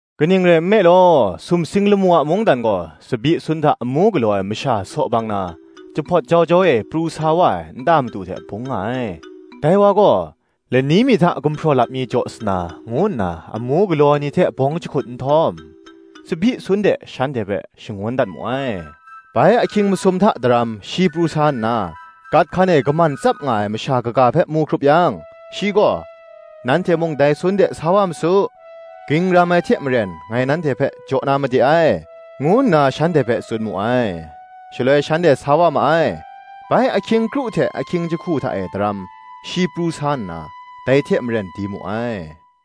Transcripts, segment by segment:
Kaning rai nme law sumsing lamu a mungdan gaw, tsabyi sun hta amu galaw ai masha saw bang na, jahpawt jau jau e pru sa wa ai nta madu hte bung nga ai. Dai wa gaw, lani mi hta gumhpraw lap mi jaw sa na, ngu nna amu galaw ai ni hte bawng jahkut nhtawm, tsabyi sun de shanhte hpe shangun dat mu ai. Bai ahkying masum daram hta shi pru sa nna, gat hkan e kaman tsap nga ai masha kaga hpe mu hkrup yang, shi gaw, Nanhte mung dai sun de sa wa ma su; ging ram ai hte maren ngai nanhte hpe jaw na made ai, ngu nna shanhte hpe tsun mu ai. Shaloi shanhte sa wa ma ai. Bai ahkying kru hte ahkying jahku hta e daram, shi pru sa nna dai hte maren di mu ai.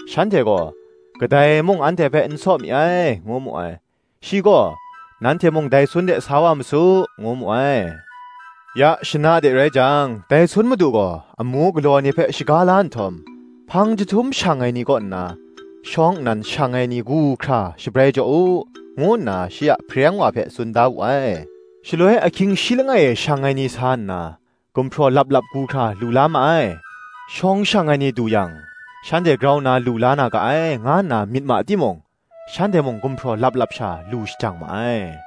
Shanhte gaw, Kadai mung anhte hpe n saw mi ai, ngu mu ai. Shi gaw, Nanhte mung dai sun de sa wa ma su, ngu mu ai. Ya shana de rai jang, dai sun madu gaw, Amu galaw ai ni hpe shaga la nhtawm, hpang jahtum shang ai ni kaw nna, shawng nnan shang ai ni gu hkra shabrai jaw u, ngu nna shi a hpareng wa hpe tsun da wu ai. Shaloi ahkying shi langai e shang ai ni sa nna, gumhpraw lap lap gu hkra lu la ma ai. Shawng shang ai ni du yang, shanhte grau nna lu la na ga ai, nga nna myit ma timung, shanhte mung gumhpraw lap lap sha lu la shajang ma ai.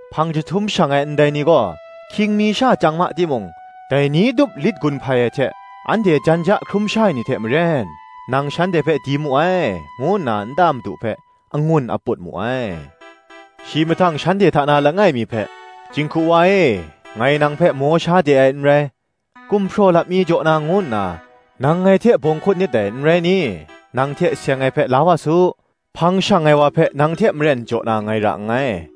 Hpang jahtum shang ai ndai ni gaw hkying mi sha chyang ma timung, dai ni tup lit gun hpai ai hte anhte jan ja hkrum sha ai ni hte maren, nang shanhte hpe di mu ai, ngu nna nta madu hpe angun aput mu ai. Shi mahtang shanhte hta na langai mi hpe, Jinghku wa e, ngai nang hpe maw sha de ai n rai: gumhpraw lap mi jaw na ngu nna, nang ngai hte bawng hkut nit dai, n rai ni? Nang hte seng ai hpe la wa su: hpang shang ai wa hpe nang hte maren jaw na ngai ra nngai.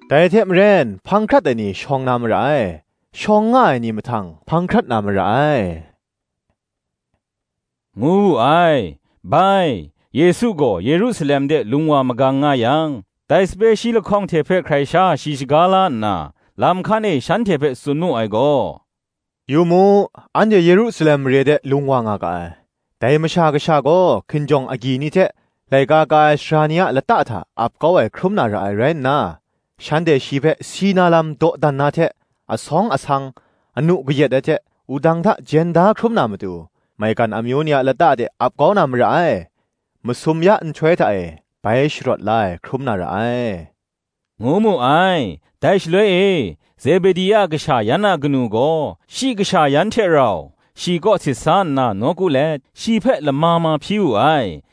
Dai hte maren, hpang hkrat ai ni, shawng na mara ai; shawng nga ai ni mahtang, hpang hkrat na mara ai, ngu wu ai. Bai, Yesu gaw Yerusalem de lung wa magang nga yang, dai sape shi lahkawng hte hpe hkrai sha shi shaga la nna, lam hkan e shanhte hpe tsun mu ai gaw, Yu mu, Anhte Yerusalem mare de lung wa nga ga ai: dai Masha Kasha gaw hkinjawng agyi ni hte laika ka ai sara ni a lata hta ap kau ai hkrum na ra ai rai nna, shanhte shi hpe si na lam dawdan na hte, asawng asang, anu kayat ai hte wudang hta jen da hkrum na matu, maigan amyu ni a lata de ap kau na mara ai; masum ya nhtoi hta e, bai sharawt la ai hkrum na ra ai,” ngu mu ai. Dai shaloi e, Zebedi a kasha yan a kanu gaw, shi kasha yan hte rau, shi kaw sit sa nna nawku let shi hpe lama ma hpyi wu ai.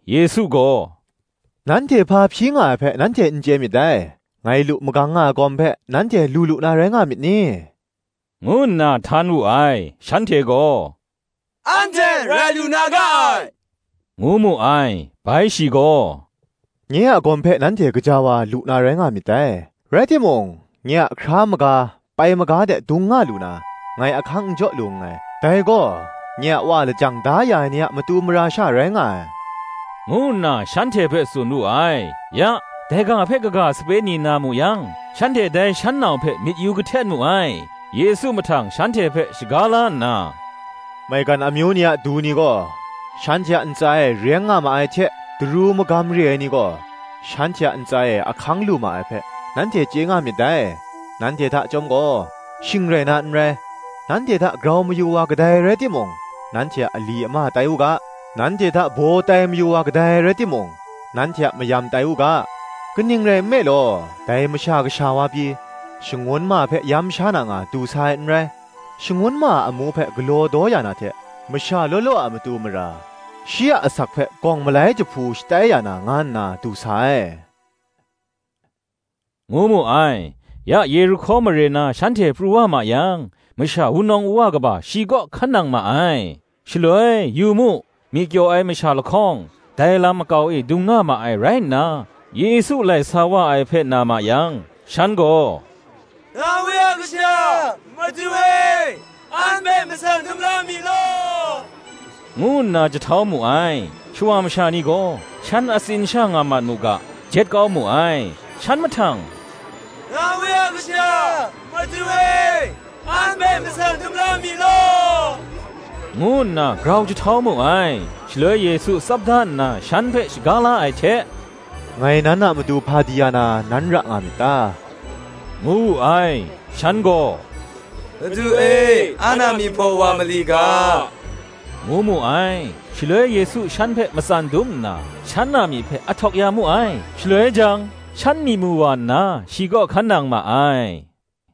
Yesu gaw, “Nanhte hpa hpyi nga ai hpe, nanhte n chye myit dai; ngai lu magang nga ai gawm hpe, nanhte lu lu na rai nga myit ni?” ngu nna htan wu ai. Shanhte gaw, “Anhte rai lu na ga ai,” ngu mu ai. Bai shi gaw, “Nye a gawm hpe nanhte gaja wa lu na rai nga myit dai; rai timung, nye a hkra maga pai maga de dung nga lu na, ngai ahkang n jaw lu nngai: dai gaw, nye a Wa lajang da ya ai ni a matu mara sha rai nga ai, ngu nna shanhte hpe tsun wu ai. Ya, dai ga hpe kaga sape shi na mu yang, shanhte dai shan nau hpe myit yu kahtet mu ai. Yesu mahtang shanhte hpe shaga la nna, “Maigan amyu ni a du ni gaw, shanhte a ntsa e reng nga ma ai hte daru magan re ai ni gaw shanhte a ntsa e ahkang lu ma ai hpe, nanhte chye nga myit dai. Nanhte hta chyawm gaw, shing rai na nrai: nanhte hta grau mayu ai wa kadai rai timung, nanhte a ali ama tai u ga: nanhte hta baw tai mayu ai wa kadai rai timung, nanhte a mayam tai u ga: kaning rai nme law, dai Masha Kasha wa pyi, shangun ma hpe yam sha na nga du sa ai n rai; shangun ma a amu hpe galaw daw ya na hte, masha law law a matu mara, shi a asak hpe gawng malai jahpu shatai ya na nga nna du sa ai,” ngu mu ai. Ya Yerihko mare na shanhte pru wa ma yang, masha wunawng wuwa kaba shi kaw hkan nang ma ai. Shaloi, yu mu, myi kyaw ai masha lahkawng, dai lam makau e dung nga ma ai rai nna, Yesu lai sa wa ai hpe na ma yang, shan gaw, “Dawi a Kasha, Madu e, an hpe matsan dum la mi law,” ngu nna jahtau mu ai. Shawa masha ni gaw, shan atsin sha nga mat mu ga, jet kau mu ai. Shan mahtang, “Dawi a Kasha, Madu e, an hpe matsan dum la mi law,” ngu nna grau jahtau mu ai. Shaloi Yesu tsap da nna shan hpe shaga la ai hte, “Ngai nan a matu hpa di ya na, nan ra nga myit ta?” ngu wu ai. Shan gaw, “Madu e, an a myi hpaw wa ma li ga,” ngu mu ai. Shaloi Yesu shan hpe matsan dum nna, shan a myi hpe ahtawk ya mu ai; shaloi jang, shan myi mu wa nna, shi kaw hkan nang ma ai.